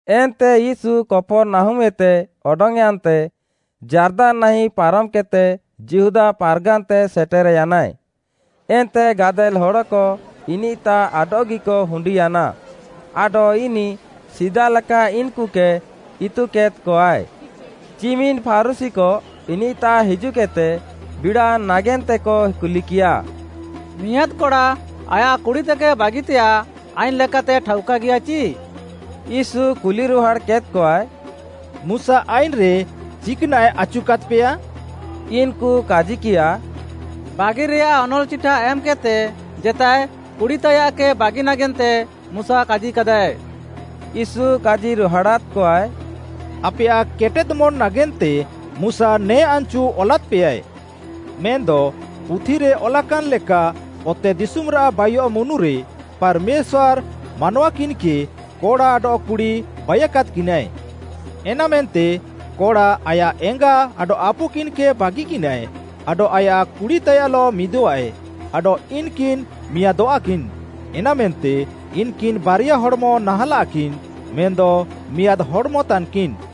ଏନ୍ତେ ୟୀଶୁ କପର୍‌ନାହୁମ୍‌ଏତେ ଅଡଙ୍ଗ୍‌ୟାନ୍‌ତେ ଯାର୍ଦାନ୍‌ନାହିଁ ପାରମ୍‌କେଦ୍‌ତେ ଯିହୁଦା ପାର୍‌ଗାନ୍‌ତେ ସେଟେର୍‌ୟାନାଏ। ଏନ୍ତେ ଗାଦେଲ୍‌ ହଡ଼କ ଇନିଃତାଃ ଆଡଃଗିକ ହୁଣ୍ଡିୟାନା ଆଡଃ ଇନିଃ ସିଦାଲେକା ଇନ୍‌କୁକେ ଇତୁକେଦ୍‌କଆଏ। ଚିମିନ୍‌ ଫାରୁଶୀକ ଇନିଃତାଃ ହିଜୁଃକେଦ୍‌ତେ ବିଡ଼ାଅ ନାଗେନ୍ତେକ କୁଲିକିୟା, “ମିଆଁଦ୍‌ କଡ଼ା ଆୟାଃ କୁଡ଼ିତେକେ ବାଗିତେଆଃ ଆଇନ୍‌ଲେକାତେ ଠାଉକାଗିୟାଃ ଚି?” ୟୀଶୁ କୁଲିରୁହାଡ଼୍‌କେଦ୍‌କଆଏ, “ମୁଶା ଆଇନ୍‌ରେ ଚିକ୍‌ନାଃଏ ଆଚୁକାଦ୍‌ପେୟା?” ଇନ୍‌କୁ କାଜିକିୟାଃ, “ବାଗିରେଆଃ ଅନଲ୍‌ଚିଠା ଏମ୍‌କେଦ୍‌ତେ ଜେତାଏ କୁଡ଼ି ତାୟାଃକେ ବାଗି ନାଗେନ୍ତେ ମୁଶା କାଜିୟାକାଦାଏ।” ୟୀଶୁ କାଜିରୁହାଡ଼ାଦ୍‌କଆଏ, “ଆପେୟାଃ କେଟେଦ୍‌ମନ୍‍ ନାଗେନ୍ତେ ମୁଶା ନେ ଆନ୍‌ଚୁ ଅଲାଦ୍‌ପେଆଏ। ମେନ୍‌ଦ ପୁଥିରେ ଅଲାକାନ୍‌ ଲେକା, ‘ଅତେଦିଶୁମ୍‌ରାଃ ବାଇୟଃ ମୁନୁରେ ପାର୍‌ମେଶ୍ୱାର୍‌ ମାନୱା କିନ୍‌କେ କଡ଼ା ଆଡଃ କୁଡ଼ି ବାଇକାଦ୍‌କିନାଏ।’ ‘ଏନାମେନ୍ତେ କଡ଼ା ଆୟାଃ ଏଙ୍ଗା ଆଡଃ ଆପୁକିନ୍‌କେ ବାଗିକିନାଏ, ଆଡଃ ଆୟାଃ କୁଡ଼ିତାୟାଃଲଃ ମିଦଃଆଏ, ଆଡଃ ଇନ୍‌କିନ୍‌ ମିଆଁଦଃଆକିନ୍‌।’ ଏନାମେନ୍ତେ ଇନ୍‌କିନ୍‌ ବାରିଆ ହଡ଼୍‌ମ ନାହାଁଲାଃକିନ୍‌, ମେନ୍‌ଦ ମିଆଁଦ୍‌ ହଡ଼୍‌ମତାନ୍‌କିନ୍‌।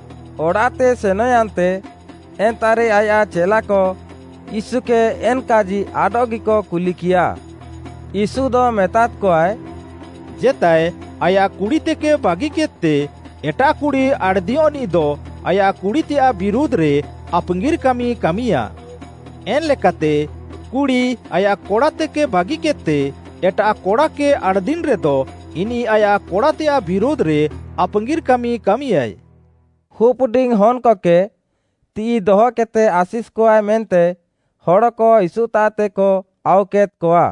ଅଡ଼ାଃତେ ସେନଃୟାନ୍ତେ, ଏନ୍ତାଃରେ ଆୟାଃ ଚେଲାକ ୟୀଶୁକେ ଏନ୍‌କାଜି ଆଡଃଗିକ କୁଲିକିୟାଃ। ୟୀଶୁଦ ମେତାଦ୍‌କଆଏ, “ଜେତାଏ ଆୟାଃ କୁଡ଼ିତେକେ ବାଗିକେଦ୍‌ତେ ଏଟାଃ କୁଡ଼ି ଆଣ୍‌ଦିୟଃନିଃଦ ଆୟାଃ କୁଡ଼ିତେୟାଃ ବିରୁଧ୍‌ରେ ଆପାଙ୍ଗିର୍‌ କାମି କାମିୟା। ଏନ୍‌ ଲେକାତେ କୁଡ଼ି ଆୟାଃ କଡ଼ାତେକେ ବାଗିକେଦ୍‌ତେ ଏଟାଃ କଡ଼ାକେ ଆଣ୍‌ଦିନ୍‌ରେଦ ଇନିଃ ଆୟାଃ କଡ଼ାତେୟାଃ ବିରୁଧ୍‌ରେ ଆପାଙ୍ଗିର୍‌ କାମି କାମିୟାଏ।” ହୁପ୍‌ଡିଙ୍ଗ୍‌ ହନ୍‌କକେ, ତିଃଇ ଦହକେଦ୍‌ତେ ଆଶିଷ୍‌କକାଏ ମେନ୍ତେ, ହଡ଼କ ୟୀଶୁତାଃତେକ ଆଉକେଦ୍‌କଆ,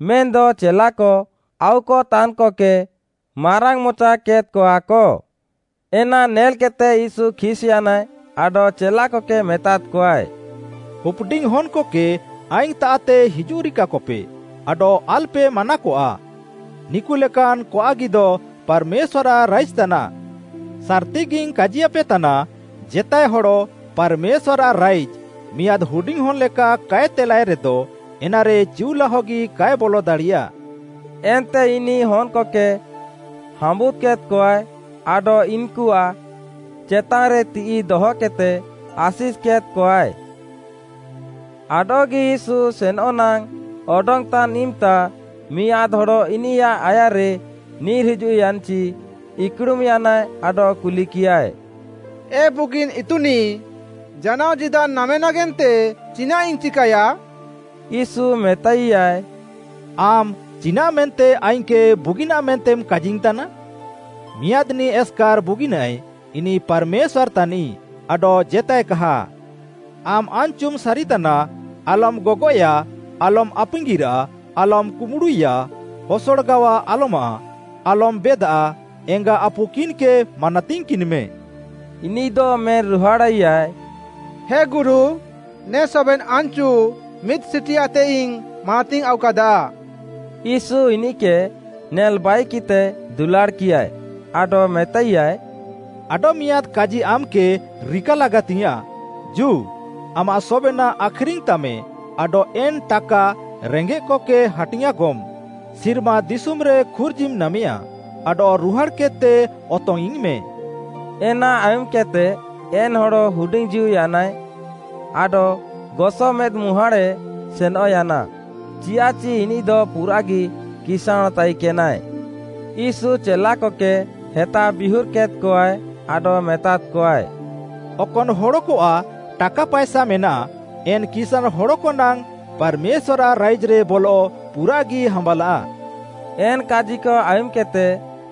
ମେନ୍‌ଦ ଚେଲାକ ଆଉକତାନ୍‌କକେ ମାରାଙ୍ଗ୍‌ମଚା କେଦ୍‌କଆକ। ଏନା ନେଲ୍‌କେଦ୍‌ତେ ୟୀଶୁ ଖିସ୍‌ୟାନାଏ ଆଡଃ ଚେଲାକକେ ମେତାଦ୍‌କଆଏ, “ହୁପ୍‌ଡିଙ୍ଗ୍‌ ହନ୍‌କକେ ଆଇଙ୍ଗ୍‌ତାଃତେ ହିଜୁଃରିକାକପେ, ଆଡଃ ଆଲ୍‌ପେ ମାନାକଆ, ନିକୁଲେକାନ୍‌ କଆଃଗିଦ ପାର୍‌ମେଶ୍ୱାର୍‌ଆଃ ରାଇଜ୍‌ ତାନାଃ। ସାର୍‌ତିଗିଙ୍ଗ୍‌ କାଜିୟାପେତାନା ଜେତାଏ ହଡ଼ ପାର୍‌ମେଶ୍ୱାର୍‌ଆଃ ରାଇଜ୍‌, ମିଆଁଦ୍‌ ହୁଡିଙ୍ଗ୍‌ହନ୍‌ ଲେକା କାଏ ତେଲାଏରେଦ, ଏନାରେ ଚିଉଲାହଗି କାଏ ବଲଦାଡ଼ିୟାଃ।” ଏନ୍ତେ ଇନିଃ ହନ୍‌କକେ ହାମ୍ବୁଦ୍‌କେଦ୍‌କଆଏ, ଆଡଃ ଇନ୍‌କୁଆଃ ଚେତାନ୍‌ରେ ତିଃଇ ଦହକେଦ୍‌ତେ ଆଶିଷ୍‌କେଦ୍‌କଆଏ। ଆଡଃଗି ୟୀଶୁ ସେନଃନାଙ୍ଗ୍‌ ଅଡଙ୍ଗ୍‌ତାନ୍‌ ଇମ୍‌ତା ମିଆଁଦ୍‌ ହଡ଼ ଇନିୟାଃ ଆୟାର୍‌ରେ ନିର୍‌ହିଜୁଃୟାନ୍‌ଚି ଇକୁଡ଼ୁମ୍‌ୟାନାଏ ଆଡଃ କୁଲିକିୟାଏ, “ଏ ବୁଗିନ୍‌ ଇତୁନିଃ, ଜାନାଅ ଜୀଦାନ୍‌ ନାମେ ନାଗେନ୍ତେ ଚିନାଃଇଙ୍ଗ୍‌ ଚିକାୟା?” ୟୀଶୁ ମେତାଇୟାଏ, “ଆମ୍‌ ଚିନାଃମେନ୍ତେ ଆଇଙ୍ଗ୍‌କେ ବୁଗିନ୍‌ ମେନ୍ତେମ୍‌ କାଜିଇଙ୍ଗ୍‌ତାନା? ମିଆଁଦ୍‌ନିଃ ଏସ୍‌କାର୍‌ ବୁଗିନାଏଃ ଇନିଃ ପାର୍‌ମେଶ୍ୱାର୍‌ ତାନିଃ ଆଡଃ ଜେତାଏକାହା। ଆମ୍‌ ଆନ୍‌ଚୁମ୍‌ ସାରିତାନା, ଆଲମ୍‌ ଗଗଏୟାଃ, ଆଲମ୍‌ ଆପାଙ୍ଗିର୍‌ରାଃ, ଆଲମ୍‌ କୁମ୍ବୁଡ଼ୁଇୟା, ହସଡ଼ଗାୱା ଆଲମାଃ, ଆଲମ୍‌ ବେଦାଃ, ଏଙ୍ଗା ଆପୁ କିନ୍‌କେ ମାନାତିଙ୍ଗ୍‌କିନ୍‌ମେ।” ଇନିଃଦ ମେନ୍‌ରୁହାଡ଼ାଇୟାଏ, “ହେ ଗୁରୁ, ନେ ସବେନ୍‌ ଆନ୍‌ଚୁ ମିଦ୍‌ସିଟିଆଏତେଇଙ୍ଗ୍‌ ମାନାତିଙ୍ଗ୍‌ ଆଉକାଦା।” ୟୀଶୁ ଇନିଃକେ ନେଲ୍‌ବାଇକିଃତେ ଦୁଲାଡ଼୍‌କିୟାଏ ଆଡଃ ମେତାଇୟାଏ, “ଆଡଃ ମିଆଁଦ୍‌ କାଜି ଆମ୍‌କେ ରିକାଲାଗାତିଙ୍ଗ୍‌ୟାଁଃ, ଜୁ, ଆମାଃ ସବେନାଃ ଆଖ୍‌ରିଙ୍ଗ୍‌ତାମେ, ଆଡଃ ଏନ୍‌ ଟାକା ରେଙ୍ଗେଃକକେ ହାଟିଙ୍ଗ୍‌ଆଁକମ୍, ସିର୍ମା ଦିଶୁମ୍‌ରେ ଖୁର୍ଜିମ୍ ନାମେଆଁ, ଆଡଃ ରୁହାଡ଼୍‌କେଦ୍‌ତେ ଅତଙ୍ଗ୍‌ଇଙ୍ଗ୍‌ମେ।” ଏନା ଆୟୁମ୍‌କେଦ୍‌ତେ ଏନ୍‌ ହଡ଼ ହୁଡିଙ୍ଗ୍‌ଜୀଉୟାନାଏ, ଆଡଃ ଗସ ମେଦ୍‌ମୁହାଁଡ଼ାଏ ସେନଃୟାନା। ଚିୟାଃଚି ଇନିଃଦ ପୁରାଃଗି କିସାଁଣ୍‌ ତାଇକେନାଏ। ୟୀଶୁ ଚେଲାକକେ ହେତାବିୟୁର୍‌କେଦ୍‌କଆଏ ଆଡଃ ମେତାଦ୍‌କଆଏ, “ଅକନ୍‌ ହଡ଼କଆଃ ଟାକା ପାଏସା ମେନାଃ, ଏନ୍‌ କିସାଁଣ୍‌ ହଡ଼କନାଙ୍ଗ୍‌ ପାର୍‌ମେଶ୍ୱାର୍‌ଆଃ ରାଇଜ୍‌ରେ ବଲଃ ପୁରାଃଗି ହାମ୍ୱାଲାଃ।” ଏନ୍‌ କାଜିକ ଆୟୁମ୍‌କେଦ୍‌ତେ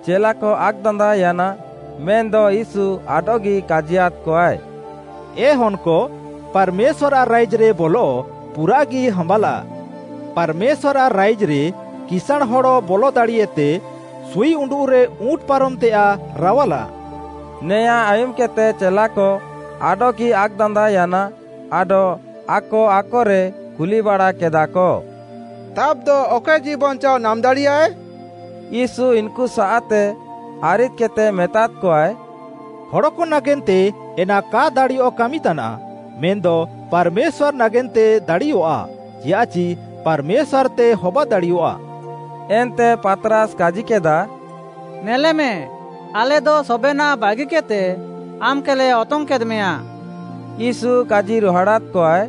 ଚେଲାକ ଆକ୍‌ଦାନ୍ଦାଅୟାନା, ମେନ୍‌ଦ ୟୀଶୁ ଆଡଃଗି କାଜିୟାଦ୍‌କଆଏ, “ଏ ହନ୍‌କ, ପାର୍‌ମେଶ୍ୱାରାଃ ରାଇଜ୍‌ରେ ବଲଃ ପୁରାଃଗି ହାମ୍ୱାଲାଃ। ପାର୍‌ମେଶ୍ୱାର୍‌ଆଃ ରାଇଜ୍‌ରେ କିସାଁଣ୍‌ ହଡ଼ ବଲ ଦାଡ଼ିଏତେ, ସୁଇଉଣ୍ଡୁଃରେ ଉଁଟ୍‌ ପାରମଃତେଆଃ ରାୱାଲାଃ।” ନେଆଁଁ ଆୟୁମ୍‌କେଦ୍‌ତେ ଚେଲାକ ଆଡଃଗି ଆକ୍‌ଦାନ୍ଦାଅୟାନା ଆଡଃ ଆକ ଆକରେ କୁଲିବାଡ଼ାକେଦାଃକ, “ତାବ୍‌ଦ ଅକଏ ଜୀଉବାଞ୍ଚାଅ ନାମ୍‌ ଦାଡ଼ିୟାଏ?” ୟୀଶୁ ଇନ୍‌କୁସାଃତେ ଆରିଦ୍‌କେଦ୍‌ତେ ମେତାଦ୍‌କଆଏ, “ହଡ଼କ ନାଗେନ୍ତେ ଏନା କା ଦାଡ଼ିୟଃ କାମି ତାନାଃ, ମେନ୍‌ଦ ପାର୍‌ମେଶ୍ୱାର୍‌ ନାଗେନ୍ତେ ଦାଡ଼ିଅଃଆ। ଚିୟାଃଚି ପାର୍‌ମେଶ୍ୱାର୍‌ତେ ହବାଦାଡ଼ିୟଆଃ।” ଏନ୍ତେ ପାତ୍‌ରାସ୍‌ କାଜିକେଦା, “ନେଲେମେ, ଆଲେଦ ସବେନାଃ ବାଗିକେଦ୍‌ତେ ଆମ୍‌କେଲେ ଅତଙ୍ଗ୍‌କେଦ୍‌ମେୟାଁ।” ୟୀଶୁ କାଜିରୁହାଡ଼ାଦ୍‌କଆଏ,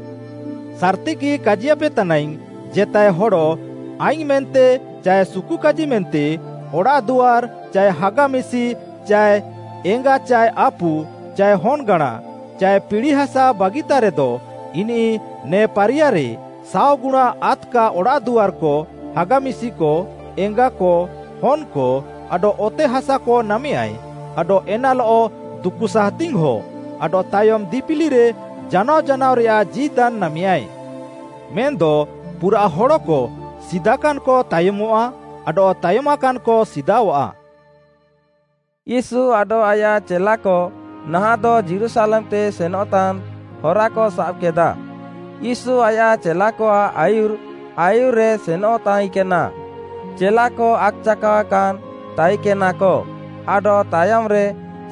“ସାର୍‌ତିଗି କାଜିୟାପେ ତାନାଇଙ୍ଗ୍‌, ଜେତାଏ ହଡ଼ ଆଇଙ୍ଗ୍‌ ମେନ୍ତେ ଚାଏ ସୁକୁକାଜିମେନ୍ତେ, ଅଡ଼ାଃଦୁଆର୍, ଚାଏ ହାଗା ଚାଏ ମିଶି, ଚାଏ ଏଙ୍ଗା ଚାଏ ଆପୁ, ଚାଏ ହନ୍‌ଗାଁଣା, ଚାଏ ପିଡ଼ିହାସା ବାଗିତାରେଦ, ଇନିଃ ନେ ପାରିୟାରେ, ସାଅଗୁଣା ଆଦ୍‌କା ଅଡ଼ାଃଦୁଆର୍‌କ, ହାଗା ମିଶିକ, ଏଙ୍ଗାକ, ହନ୍‌କ ଆଡଃ ଅତେହାସାକ ନାମେୟାଏ, ଆଡଃ ଏନାଲଃ ଦୁକୁସାସ୍‌ତି ହଁ, ଆଡଃ ତାୟମ୍‌ ଦିପିଲିରେ ଜାନାଅ ଜାନାଅରେୟାଃ ଜୀଦାନ୍‌ ନାମେୟାଏ। ମେନ୍‌ଦ ପୁରାଃ ହଡ଼କ ସିଦାକାନ୍‌କ ତାୟମଃଆ, ଆଡଃ ତାୟମାକାନ୍‌କ ସିଦାଅଃଆ।” ୟୀଶୁ ଆଡଃ ଆୟାଃ ଚେଲାକ ନାହାଁଃଦ ଯୀରୁଶାଲେମ୍‌ତେ ସେନଃତାନ୍‌ ହରାକ ସାବ୍‌କେଦା। ୟୀଶୁ ଆୟାଃ ଚେଲାକଆଃ ଆୟୁର୍‌ ଆୟୁର୍‌ରେ ସେନଃ ତାଇକେନା, ଚେଲାକ ଆକ୍‌ଚାକାଅକାନ୍‌ ତାଇକେନାକ ଆଡଃ ତାୟମ୍‌ରେ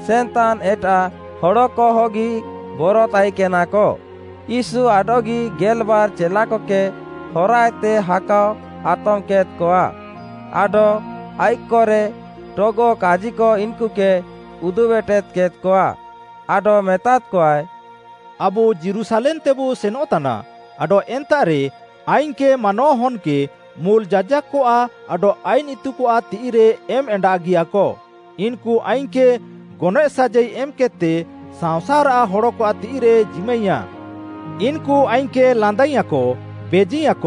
ସେନ୍‌ତାନ୍‌ ଏଟାଃ ହଡ଼କହଗି ବର ତାଇକେନାକ। ୟୀଶୁ ଆଡଃଗି ଗେଲ୍‌ବାର୍‌ ଚେଲାକକେ ହରାଏତେ ହାକାଅ ଆତମ୍‌କେଦ୍‌କଆ, ଆଡଃ ଆଇଃକ୍‌ରେ ଟଗଃ କାଜିକ ଇନ୍‌କୁକେ ଉଦୁବ୍‌ ଏଟେଦ୍‌କେଦ୍‌କଆ। ଆଡଃ ମେତାଦ୍‌କଆଏ, “ଆବୁ ଯୀରୁଶାଲେମ୍‌ତେବୁ ସେନଃତାନା, ଆଡଃ ଏନ୍ତାଃରେ ଆଇଙ୍ଗ୍‌କେ ମାନୱାହନ୍‌କେ ମୁଲ୍‌ ଯାଜାକ୍‌କଆଃ ଆଡଃ ଆଇନ୍‌ ଇତୁକଆଃ ତିଃଇରେ ଏମ୍‌ଏଣ୍ଡାଗିଆଁକ। ଇନ୍‌କୁ ଆଇଙ୍ଗ୍‌କେ ଗନଏଃ ସାଜାଇ ଏମ୍‌କେଦ୍‌ତେ ସାଅଁସାର୍‌ ହଡ଼କଆଃ ତିଃଇରେକ ଜିମାଇଁୟାଃ। ଇନ୍‌କୁ ଆଇଙ୍ଗ୍‌କେ ଲାନ୍ଦାୟାଃଁକ, ବେଜିୟାଃଁକ,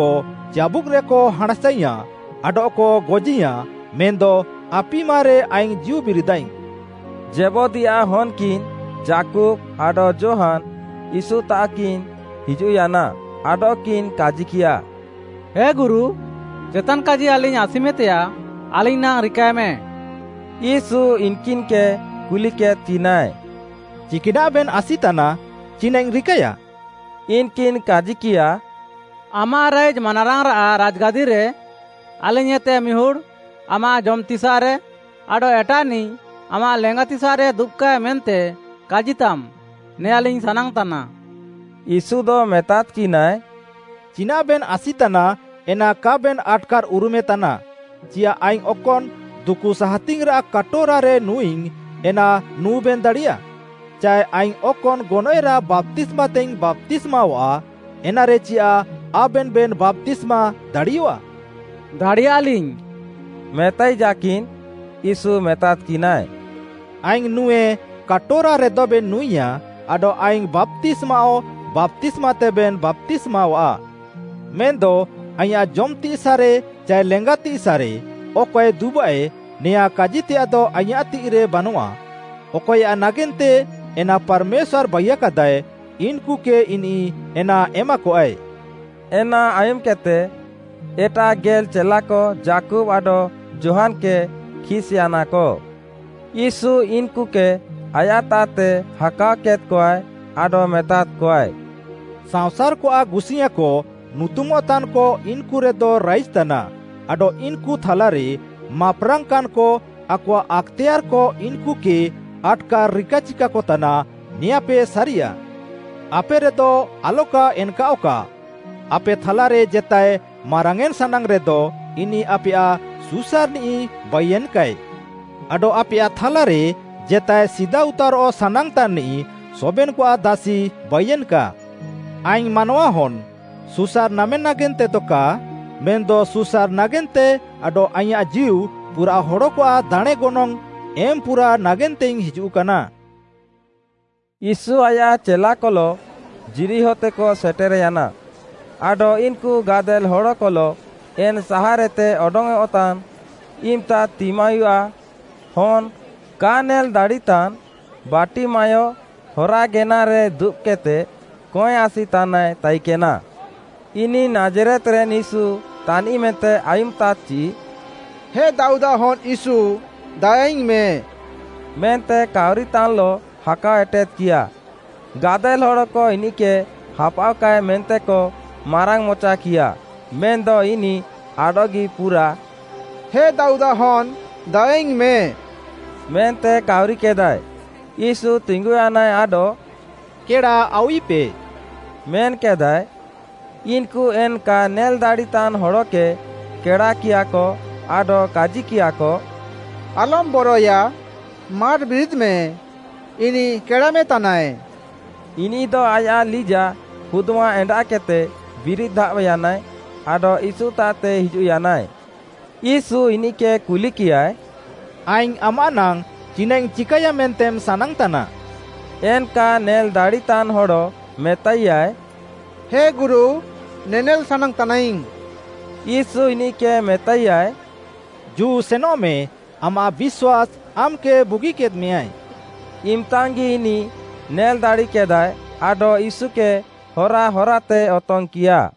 ଚାବୁକ୍‌ରେକ ହାଁଣ୍‌ସାୟାଁଃ, ଆଡଃକ ଗଜିୟାଁ ମେନ୍‌ଦ ଆପିମାରେ ଆଇଙ୍ଗ୍‌ ଜୀଉ ବିରିଦାଇଙ୍ଗ୍‌।” ଜେବଦୀୟାଃ ହନ୍‌କିନ୍‌ ଯାକୁବ୍‌ ଆଡଃ ଯୋହାନ୍‌, ୟୀଶୁତାଃକିନ୍ ହିଜୁଃୟାନା, ଆଡଃକିନ୍ କାଜିକିୟା, “ହେ ଗୁରୁ ଜେତାନ୍‌କାଜି ଆଲିଙ୍ଗ୍‌ ଆସିମେତେୟାଃ ଆଲିଙ୍ଗ୍‌ ନାଙ୍ଗ୍‌ ରିକାଏମେ।” ୟୀଶୁ ଇନ୍‌କିନ୍‌କେ କୁଲିକେଦ୍‌କିନାଏ, “ଚିକାନାଃବେନ୍ ଆସିତାନା, ଚିନାଃଇଙ୍ଗ୍‌ ରିକାୟା?” ଇନ୍‌କିନ୍‌ କାଜିକିୟା, “ଆମାଃ ରାଇଜ୍‌ ମାନାରାଙ୍ଗ୍‌ରାଃ ରାଜ୍‌ଗାଦିରେ ଆଲିଙ୍ଗ୍‌ଏତେ ମିହୁଡ଼୍‌ ଆମାଃ ଜମ୍‌ତିସାଃରେ, ଆଡଃ ଏଟାଃନିଃ ଆମାଃ ଲେଙ୍ଗାତିସାଃରେ ଦୁବ୍‌କାଏ ମେନ୍ତେ କାଜିତାମ୍, ନେୟାଁଲିଙ୍ଗ୍‌ ସାନାଙ୍ଗ୍‌ତାନା।” ୟୀଶୁଦ ମେତାଦ୍‌କିନାଏ, “ଚିନାଃବେନ୍ ଆସିତାନା ଏନା କାବେନ୍‌ ଆଟ୍‌କାର୍‌ ଉରୁମେତାନା। ଚିୟାଃ ଆଇଙ୍ଗ୍‌ ଅକନ୍‌ ଦୁକୁସାହାତିଙ୍ଗ୍‌ରାଃ କାଟୋରାରେ ନୁଁଇଙ୍ଗ୍‌, ଏନା ନୁଁବେନ୍‌ ଦାଡ଼ିୟା? ଚାଏ ଆଇଙ୍ଗ୍‌ ଅକନ୍‌ ଗନଏଃରାଃ ବାପ୍ତିସ୍ମାତେଇଙ୍ଗ୍‌ ବାପ୍ତିସ୍ମାଅଃଆ, ଏନାରେ ଚିନାଃ ଆବେନଃବେନ୍ ବାପ୍ତିସ୍ମା ଦାଡ଼ିୟଃଆ?” “ଦାଡ଼ିୟାଃଲିଙ୍ଗ୍‌,” ମେତାଇଜାକିନ୍‌, ୟୀଶୁ ମେତାଦ୍‌କିନାଏ, “ଆଇଙ୍ଗ୍‌ ନୁଁଏ କାଟୋରାରେଦବେନ୍ ନୁଁଇୟାଃ ଆଡଃ ଆଇଙ୍ଗ୍‌ ବାପ୍ତିସ୍ମାଅଃ ବାପ୍ତିସ୍ମାତେବେନ୍ ବାପ୍ତିସ୍ମାଅଃଆ। ମେନ୍‌ଦ ଆଇଁୟାଃ ଜମ୍‌ତିସାଃରେ ଚାଏ ଲେଙ୍ଗାତିସାଃରେ ଅକଏ ଦୁବାଃଏ ନେଆଁଁ କାଜିତେୟାଃଦ ଆଇଁୟାଃ ତିଃଇରେ ବାନଆଃ। ଅକଏୟାଃ ନାଗେନ୍ତେ ଏନା ପାର୍‌ମେଶ୍ୱାର୍‌ ବାଇୟାକାଦାଃଏ ଇନ୍‌କୁକେ ଇନିଃ ଏନା ଏମାକଆଏ।” ଏନା ଆୟୁମ୍‌କେଦ୍‌ତେ, ଏଟାଃ ଗେଲ୍‌ ଚେଲାକ ଯାକୁବ୍‌ ଆଡଃ ଯୋହାନ୍‌କେ ଖିସ୍‌ୟାନାକ। ୟୀଶୁ ଇନ୍‌କୁକେ ଆୟାଃତାଃତେ ହାକାଅ କେଦ୍‌କଆଏ ଆଡଃ ମେତାଦ୍‌କଆଏ, “ସାଅଁସାର୍‌କଆଃ ଗୁସିୟାଁକ ନୁତୁମଃତାନ୍‌କ ଇନ୍‌କୁରେକ ରାଇଜ୍‌ତାନା ଆଡଃ ଇନ୍‌କୁ ଥାଲାରେ ମାପ୍‌ରାଙ୍ଗ୍‌କାନ୍‌କ ଆକଆଃ ଆକ୍‌ତେୟାର୍‌କ ଇନ୍‌କୁକେ ଆଟ୍‌କାର୍‌ ରିକାଚିକାକତାନା, ନେଆଁଁପେ ସାରିଆଃ। ଆପେରେଦ ଆଲକା ଏନ୍‌କାଅଃକା। ଆପେ ଥାଲାରେ ଜେତାଏ ମାରାଙ୍ଗ୍‌ୟେଁନ୍‌ ସାନାଙ୍ଗ୍‌ରେଦ ଇନିଃ ଆପେୟାଃ ସୁସାର୍‌ନିଃ ବାଇୟେନ୍‌କାଏ। ଆଡଃ ଆପେୟାଃ ଥାଲାରେ ଜେତାଏ ସିଦାଉତାରଃ ସାନାଙ୍ଗ୍‌ତାନ୍‌ନିଃ ସବେନ୍‌କଆଃ ଦାସି ବାଇୟେନ୍‌କା। ଆଇଙ୍ଗ୍‌ ମାନୱାହନ୍‌, ସୁସାର୍‌ନାମେ ନାଗେନ୍ତେଦ କା, ମେନ୍‌ଦ ସୁସାର୍‌ ନାଗେନ୍ତେ ଆଡଃ ଆଇଁୟାଃ ଜୀଉ ପୁରାଃ ହଡ଼କଆଃ ଦାଣେଁ ଗନଙ୍ଗ୍‌ ଏମ୍‌ପୁରା ନାଗେନ୍ତେଇଙ୍ଗ୍‌ ହିଜୁଃକାନା।” ୟୀଶୁ ଆୟାଃ ଚେଲାକଲଃ ଯିରିହୋତେକ ସେଟେର୍‌ୟାନା, ଆଡଃ ଇନ୍‌କୁ ଗାଦେଲ୍‌ ହଡ଼କଲଃ ଏନ୍‌ ସାହାର୍‌ଏତେ ଅଡଙ୍ଗ୍‌ଅଃତାନ୍‌ ଇମ୍‌ତା ତିମାୟୁଆଃ ହନ୍‌ କା ନେଲ୍‌ଦାଡ଼ିତାନ୍‌ ବାର୍ଟିମାୟ ହରାଗେନାରେ ଦୁବ୍‌କେଦ୍‌ତେ କଏଁ ଆସିତାନାଏ ତାଇକେନା। ଇନିଃ ନାଜ୍‌ରେତ୍‌ରେନ୍‌ ୟୀଶୁ ତାନିଃ ମେନ୍ତେ ଆୟୁମ୍‌ତାଦ୍‌ଚି, “ହେ ଦାଉଦ୍‌ଆଃ ହନ୍‌ ୟୀଶୁ ଦାୟାଇଙ୍ଗ୍‌ମେ” ମେନ୍ତେ କାଉରିତାନ୍‌ଲଃ ହାକାଅ ଏଟେଦ୍‌କିୟା। ଗାଦେଲ୍‌ ହଡ଼କ ଇନିଃକେ ହାପାଅଃକାଏ ମେନ୍ତେକ ମାରାଙ୍ଗ୍‌ମଚାକିୟାଃ। ମେନ୍‌ଦ ଇନିଃ ଆଡଃଗି ପୁରାଃ “ହେ ଦାଉଦ୍‌ଆଃ ହନ୍‌ ଦାୟାଇଙ୍ଗ୍‌ମେ” ମେନ୍ତେ କାଉରିକେଦାଏ। ୟୀଶୁ ତିଙ୍ଗୁୟାନାଏ ଆଡଃ, “କେଡ଼ାଆଉଇପେ” ମେନ୍‌କେଦାଏ। ଇନ୍‌କୁ ଏନ୍‌ କା ନେଲ୍‌ଦାଡ଼ିତାନ୍‌ ହଡ଼କେ କେଡ଼ାକିୟାଃକ ଆଡଃ କାଜିକିୟାକ, “ଆଲମ୍‌ ବରଏୟା, ମାର୍‌ ବିରିଦ୍‌ମେ! ଇନିଃ କେଡ଼ାମେତାନାଏ।” ଇନିଃଦ ଆୟାଃ ଲିଜାଃ ହୁଦ୍‌ମା ଏଣ୍ଡାଃକେଦ୍‌ତେ ବିରିଦ୍‌ ଧାବ୍‌ୟାନାଏ ଆଡଃ ୟୀଶୁତାଃତେ ହିଜୁଃୟାନାଏ। ୟୀଶୁ ଇନିଃକେ କୁଲିକିୟାଏ, “ଆଇଙ୍ଗ୍‌ ଆମାଃ ନାଙ୍ଗ୍‌ ଚିନାଃଇଙ୍ଗ୍‌ ଚିକାୟା ମେନ୍ତେମ୍ ସାନାଙ୍ଗ୍‌ତାନା” ଏନ୍‌ କା ନେଲ୍‌ଦାଡ଼ିତାନ୍‌ ହଡ଼ ମେତାଇୟାଏ, “ହେ ଗୁରୁ ନେନେଲାଇଙ୍ଗ୍‌ ସାନାଙ୍ଗ୍‌ତାନା।” ୟୀଶୁ ଇନିଃକେ ମେତାଇୟାଏ, “ଜୁ ସେନଃମେ, ଆମାଃ ବିଶ୍ୱାସ୍‌ ଆମ୍‌କେ ବୁଗିକେଦ୍‌ମେୟାଏ।” ଇମ୍‌ତାଙ୍ଗ୍‌ଗି ଇନିଃ ନେଲ୍‌ ଦାଡ଼ିକେଦାଏ ଆଡଃ ୟୀଶୁକେ ହରାହରାତେ ଅତଙ୍ଗ୍‌କିୟା।